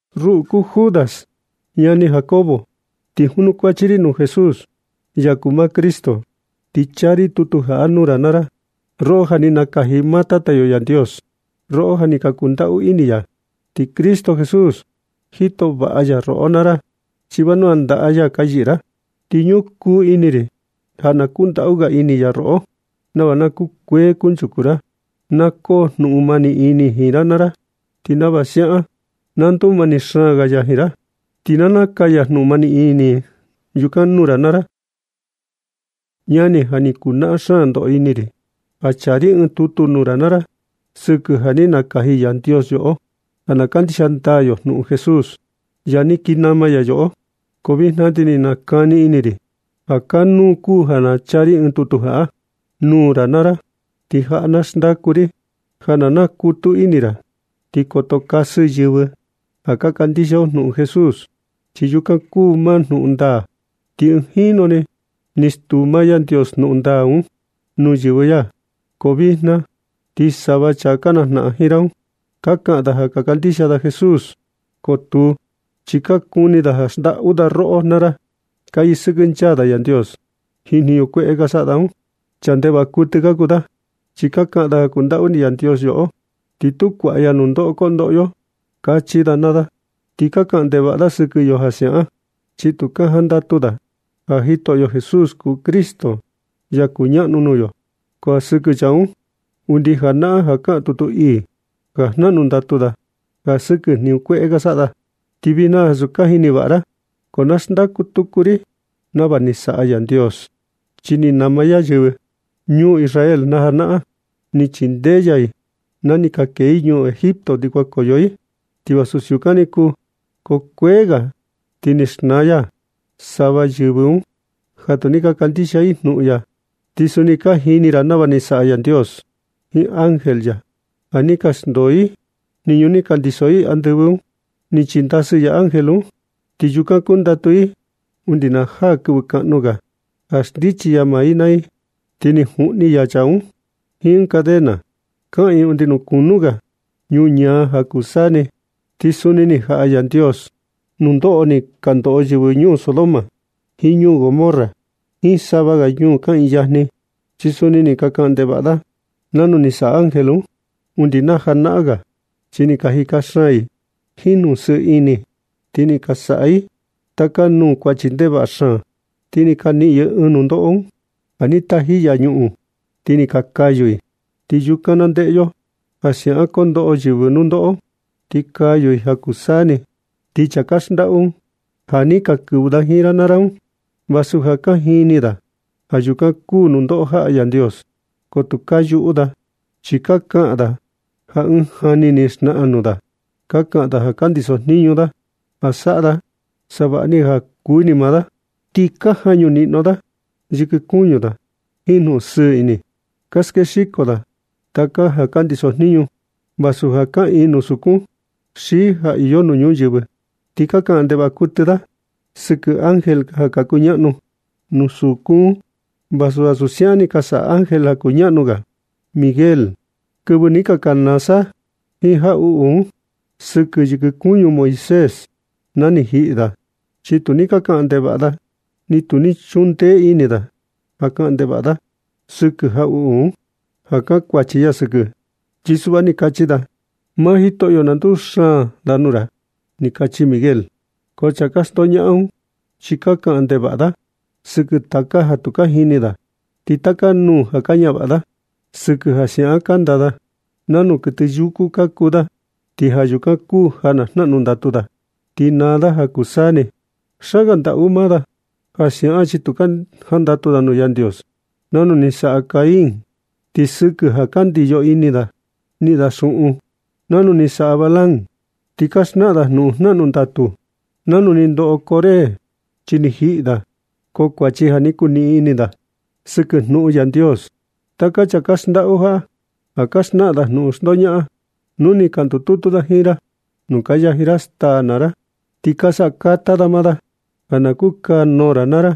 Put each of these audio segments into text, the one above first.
Ruꞌu kuu Judas, ñani Jacobo, ti junukuachi ri nuu Jesús, ya kuu maa Cristo. Ti chaa ri tutu jaꞌa nuu ra naa ra, roꞌo ja ni nakaji maa Tata yo Yandios, roꞌo ja ni kundaꞌu ini ya. Ti Cristo Jesús, jito vaꞌa ya roꞌo naa ra, chi vanua ndaꞌa maa ya ka yɨꞌɨ ra. Ti ñukuu ini ri ja na kundaꞌu ga ini ya roꞌo, nava na kukuee kunchuku ra. Na koo jnuꞌun mani ini ra jiin ya naa ra, ti nava siaꞌan na ndumani xaan ga ya jiin ra. Ti na nakaya jnumani ini yukan nuu ra naa ra. Ñani, ja ni kuu naꞌan ndoꞌo xaan ini ri ja chaa ri ɨɨn tutu nuu ra naa ra, sɨkɨ ja ni nakaji Yandios yoꞌo ja ka kandixia ndaa yo jnuꞌun Jesús, ya ni kii nama yoꞌo. Ko vijna ti ni nakani ini ri ja kanuu kuu ja na chaa ri ɨɨn tutu jaꞌa nuu ra naa ra. Ti jaꞌa na xndaku ri ja na nakutu ini ra ti koto kasɨ yɨvɨ ja ka kandixia yo jnuꞌun Jesús, chi yukan kuu maa jnuꞌun ndaa. Ti ɨɨn jinu ni ni stuu maa Yandios jnuꞌun ndaa un nuu yɨvɨ ya. Ko vijna, ti sava chaa ka najnaꞌan jiin ra un, ka kaꞌan da ja ka kandixia da Jesús, ko tuu. Chi ka kuni da xndaꞌu da roꞌo naa ra. Ka yɨsɨkɨnchaa da Yandios jiin jniñu kueꞌe ka saꞌa da un. Chaa ndevaꞌa kuɨtɨ ka kuu da, chi ka kaꞌan da ja kundaꞌu ini Yandios yoꞌo, ti tu kuaꞌa ya nundoꞌo kondoꞌo yo, kachi da naa da. Ti ka kaꞌan ndevaꞌa da sɨkɨ yo ja siaꞌan, chi tu ka jantaꞌu da ja Jitoꞌo Jesús kuu Cristo, ya kuñaꞌnu nuu yo. Ko sɨkɨ chaa un, undi janaꞌan ja kaꞌan tutu ii ja jnaꞌnu ndatu da ja sɨkɨ jniñu kueꞌe ka saꞌa da. Ti vijna, vasu ja ka jini vaꞌa ra, ko na naxndaku tuku ri nava ni saꞌa Yandios. Chi ni nama ya yɨvɨ ñuu Israel najanaꞌan. Ni chindee ya i na ni ka kee i ñuu Egipto kuankoyo i. Ti vasu siukan ni kuu, ko kuee ga ti ni xnaa ya sava yɨvɨ un ja tu ni ka kandixia i jnuꞌun ya. Ti suni ka jini ra nava ni saꞌa Yandios jiin ángel ya ja ni ka xndoo i jniñu ni ka ndiso i andɨvɨ un. Ni chindasɨ ya ángel un, ti yukan kundatu da undi na jaa kɨvɨ kaꞌnu ga ja xndichi ya maa da naa da. Ti ni juꞌni ya chaa un jiin cadena kaꞌiin undi nuu kunu ga ñuñaa ja kuu saa ni. Ti suni ni jaꞌa Yandios nundoꞌo ni ka ndoꞌo yɨvɨ ñuu Sodoma jiin ñuu Gomorra jiin sava ga ñuu kaꞌiin yajni. Chi suni ni ka saꞌa ndevaꞌa da nanu ni saꞌa ángel un undi na janaꞌan ga. Chi ni ka jika xaan i jiin jnuꞌun sɨɨ ini, ti ni ka saꞌa i taka nuu kuachi ndevaꞌa xaan. Ti ni ka niꞌin i ɨɨn nundoꞌo ja ni taji ya ñuꞌun ti ni ka kayu i, ti yukan na ndeꞌe yo ja siaꞌan kondoꞌo yɨvɨ nundoꞌo, ti kayu i ja kuu saa ni. Ti chaa ka xndaꞌu ja ni ka kɨvɨ da jiin ra naa ra un, vasu ja ka jini da ja yukan kuu nundoꞌo jaꞌa Yandios, ko tu ka yuꞌu da, chi ka kaꞌan da ja ɨɨn jani ni xnaꞌan nuu da. Ka kaꞌan da ja ka ndiso jniñu da ja na saꞌa da savaꞌni ga ja kuu ini maa da. Ti ka jañu niꞌno da yɨkɨ kuñu da jiin jnuꞌun sɨɨ ini, ka skexiko da taka ja ka ndiso jniñu, vasu ja kaꞌiin nuu sukun xi ja iyo nuu ñuyɨvɨ. Ti ka kaꞌan ndevaꞌa kuɨtɨ da sɨkɨ ángel ja ka kuñaꞌnu nuu sukun un. Vasu ansu siaꞌan ni saꞌa ángel kuñaꞌnu ga Miguel kɨvɨ ni ka kanaa sa jiin jaꞌuꞌu un sɨkɨ yɨkɨ kuñu Moisés na ni jiꞌi da. Chi tu ni kaꞌan ndevaꞌa da, ni tu ni chundee ini da ja kaꞌan ndevaꞌa da sɨkɨ jaꞌuꞌu un, ja kankuachi ya sɨkɨ. Chi suꞌva ni kachi da: “Maa Jitoꞌo, na nduxaan da nuu ra”, ni kachi Miguel. Ko chaa ka xndoñaꞌan un chi ka kaꞌan ndevaꞌa da sɨkɨ taka ja tu ka jini da. Ti taka nuu ja ka ñavaꞌa da sɨkɨ ja siaꞌan kanda da, nanu kuɨtɨ yuku ka kuu da. Ti ja yukan kuu ja na jnaꞌnu ndatu da, ti naa da ja kuu saa ni. Xaan ga ndaꞌu maa da ja siaꞌan, chi tu ka jandatu da nuu Yandios nanu ni saꞌa Caín. Ti sɨkɨ ja ka ndiyo ini da niꞌin da xuꞌun, nanu ni saꞌa Balaam. Ti ka xnaꞌan da jnuꞌun jnaꞌnu ndatu, nanu ni ndoꞌo Coré, chi ni jiꞌi da, ko kuachi ja ni nduniꞌin ini da sɨkɨ jnuꞌun Yandios. Taka chaa ka xndaꞌu jaꞌa, ja ka xnaꞌan da jnuꞌun xndoñaꞌan, nu ni ka ndututu da jiin ra nuu ka yaji ra staa naa ra. Ti ka saꞌa kata da maa da ja na kukanuu ra naa ra.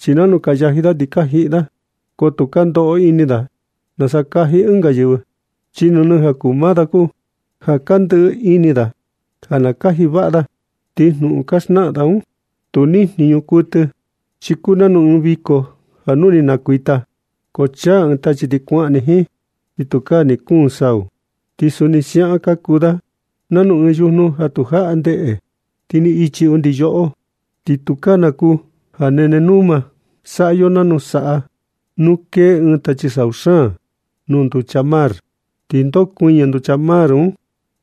Chi nanu ka yaji da ti ka jiꞌi da, ko tu ka ndoꞌo ini da nasa kaji ɨnga yɨvɨ, chi nɨnɨ ja kuu maa ni kuu ja ka ndɨꞌɨ ini da ja na kaji vaꞌa da. Ti jnuꞌun ka xnaꞌan da un, tu nijniñu kuɨtɨ, chi kuu nanu ɨɨn viko nu ni nukuita, ko chaa ɨɨn tachi ti kuaꞌan ni jiin, ti tukaa ni kuun sau. Ti suni ka kuu da nanu ɨɨn yujnu ja tu jaꞌa ndeꞌe, ti ni ichi undi yoꞌo, ti tukaa na kuu ja nene numa. Saꞌa yo nanu saꞌa. Nu kee ɨɨn tachi sau xaan nuu nducha mar, ti ndokuɨñɨ nducha nuu mar un,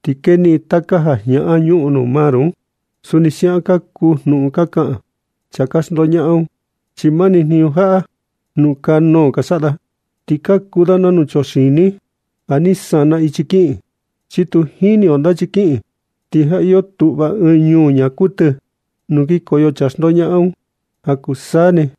ti keniꞌin taka ja jñaꞌan ñuꞌun nuu mar un. Suni siaꞌan kuu jnuꞌun ka kaꞌan chaa ka xndoñaꞌan un, chi mani jniñu jaꞌa jnukanuu ka saꞌa da. Ti ka kuu da nanu chuxini ja ni sana ichi kiꞌin, chi ni tu jini yo nanu kiꞌin. Ti ja iyo tuꞌva ɨɨn nuu ñaa kuɨtɨ nuu kinkoyo chaa ka xndoñaꞌan un ja kuu saa ni.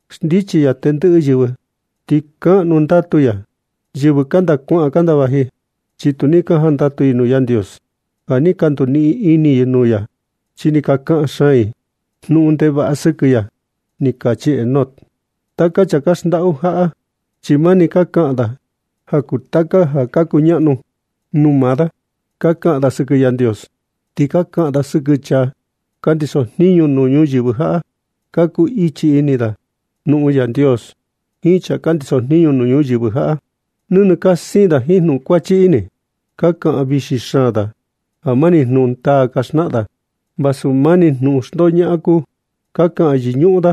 Xndichi ya tendɨꞌɨ yɨvɨ, ti kaꞌnu ndatu ya yɨvɨ kanda kuaꞌan kanda vaji. Chi tu ni ka jandatu i nuu Yandios ja ni ka nduniꞌin ini i nuu ya. Chi ni ka kaꞌan xaan i jnuꞌun ndevaꞌa sɨkɨ ya”, ni kachi Enoc. Taka chaa ka xndaꞌu jaꞌa, chi mani ka kaꞌan da ja kuu taka ja ka kuñaꞌnu nuu maa da. Ka kaꞌan da sɨkɨ Yandios, ti ka kaꞌan da sɨkɨ chaa ka ndiso jniñu nuu ñuyɨvɨ jaꞌa. Ka kuu ichi ini da jnuꞌun Yandios jiin chaa ka ndiso jniñu nuu ñuyɨvɨ jaꞌa. Nɨnɨ ka siin da jiin jnuꞌun kuachi ini. Ka kaꞌan vixi xaan da ja mani jnuꞌun ndaa ka xnaꞌan da, vasu mani jnuꞌun xndoñaꞌan kuu. Ka kaꞌan yɨñuꞌun da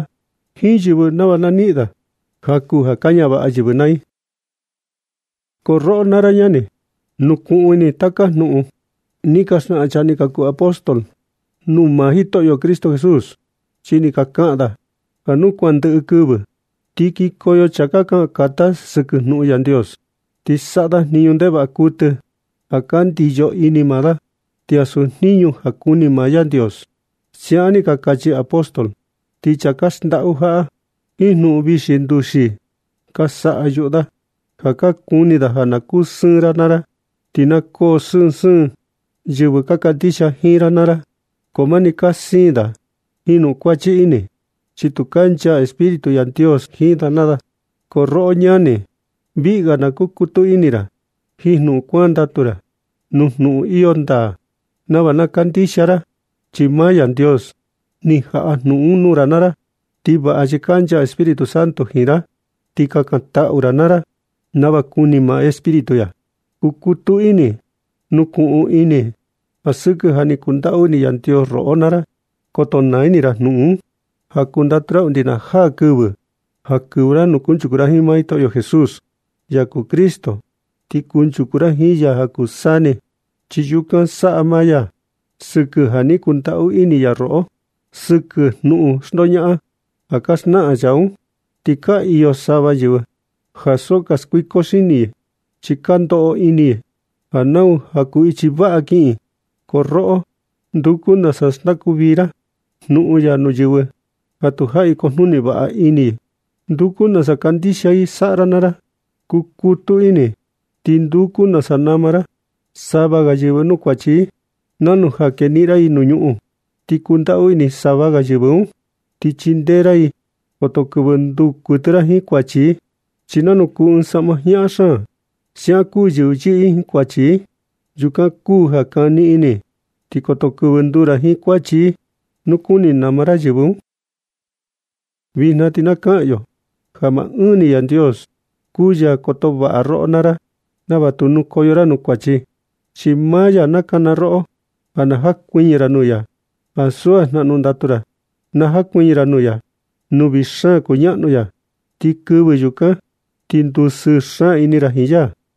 jiin yɨvɨ nava na niꞌin da jaku ja ka ñavaꞌa yɨvɨ naa i. Ko roꞌo naa ra ñani, nukuꞌun ini taka jnuꞌun ni ka xnaꞌan chaa ni ka kuu apóstol nuu maa Jitoꞌo Cristo Jesús. Chi ni ka kaꞌan da: “Ja nu kuan ndɨꞌɨ kɨvɨ, ti kikoyo chaa kaꞌan kata sɨkɨ jnuꞌun Yandios, ti saꞌa da jniñu ndevaꞌa kuɨtɨ ja ka ndiyo ini maa da, ti ansu jniñu ja kuni maa Yandios.” Siaꞌan ni ka kachi apóstol. Ti chaa ka xndaꞌu jaꞌa jiin jnuꞌun vixi nduxii, ka saꞌa yuꞌu da ja ka kuni da ja na kusɨɨn ra naa ra, ti na koo sɨɨn sɨɨn yɨvɨ ka kandixia jiin ra naa ra. Ko mani ka siin da jiin jnuꞌun kuachi ini, chi tu kancha Espíritu Yandios jiin da naa da. Ko roꞌo ñani, viꞌi ga na kukutu ini ra jiin jnuꞌun kuandatu nuu jnuꞌun iyo ndaa nava ka kandixia ra, chi maa Yandios ni jaꞌa jnuꞌun un nuu ra naa ra. Ti vaꞌa chi kancha Espíritu Santo jiin ra, ti kakantaꞌu naa ra nava kuni maa Espíritu ya. Kukutu ini, nukuꞌun ini ja sɨkɨ ni kundaꞌu ini Yandios roꞌo naa ra. Koto naa ini ra jnuꞌun un ja kundatu ra undi na jaa kɨvɨ ja kɨvɨ ra nuu kuchaku ra jiin Jitoꞌo Jesús, ya kuu Cristo, ti kunchuku ra jiin ya ja kuu saa ni. Chi yukan saꞌa maa ya sɨkɨ ja ni kundaꞌu ini ya yoꞌo. Sɨkɨ jnuꞌun xndoñaꞌan ja ka xnaꞌan chaa un, ti ka iyo sava yɨvɨ ja so ka skuiko xini i, chi ka ndoꞌo ini i ja nau ichi vaꞌa ga ja kiꞌin i. Ko roꞌo, nduku nasa xndaku vii ra jnuꞌun ya nuu yɨvɨ ja tujaꞌi kujnuni vaꞌa ini. Nduku nasa kandixia i saꞌa ra naa ra. Kukutu ini ti nduku nasa nama ra sava ga yɨvɨ nuu kuachi i, nanu ja keniꞌin ra i nuu ñuꞌun. Ti kundaꞌu ini sava ga yɨvɨ un ti chindee ra i. Koto kɨvɨ nduu kuɨtɨ ra jiin kuachi i, chi nanu kuu ɨɨn saꞌma jñaꞌan xaan, siaꞌan kuu yɨvɨ yɨꞌɨ jiin kuachi i. Yukan kuu ja kani ini, ti koto kɨvɨ nduu ra jiin kuachi i nu kuni nama ra yɨvɨ un. Vijna ti na kaꞌan yo ja maa ɨɨn ni Yandios kuu ya koto vaꞌa roꞌo naa ra nava tu nukoyo ra nuu kuachi. Chi maa ya nakana roꞌo ja na jakuɨñɨ ra nuu ya, ansu ja jnaꞌnu ndatu ra. Na jakuɨñɨ ra nuu ya, nuu vii xaan kuñaꞌnu ya. Ti kɨvɨ yukan, na ti ndusɨɨ xaan ini ra jiin ya.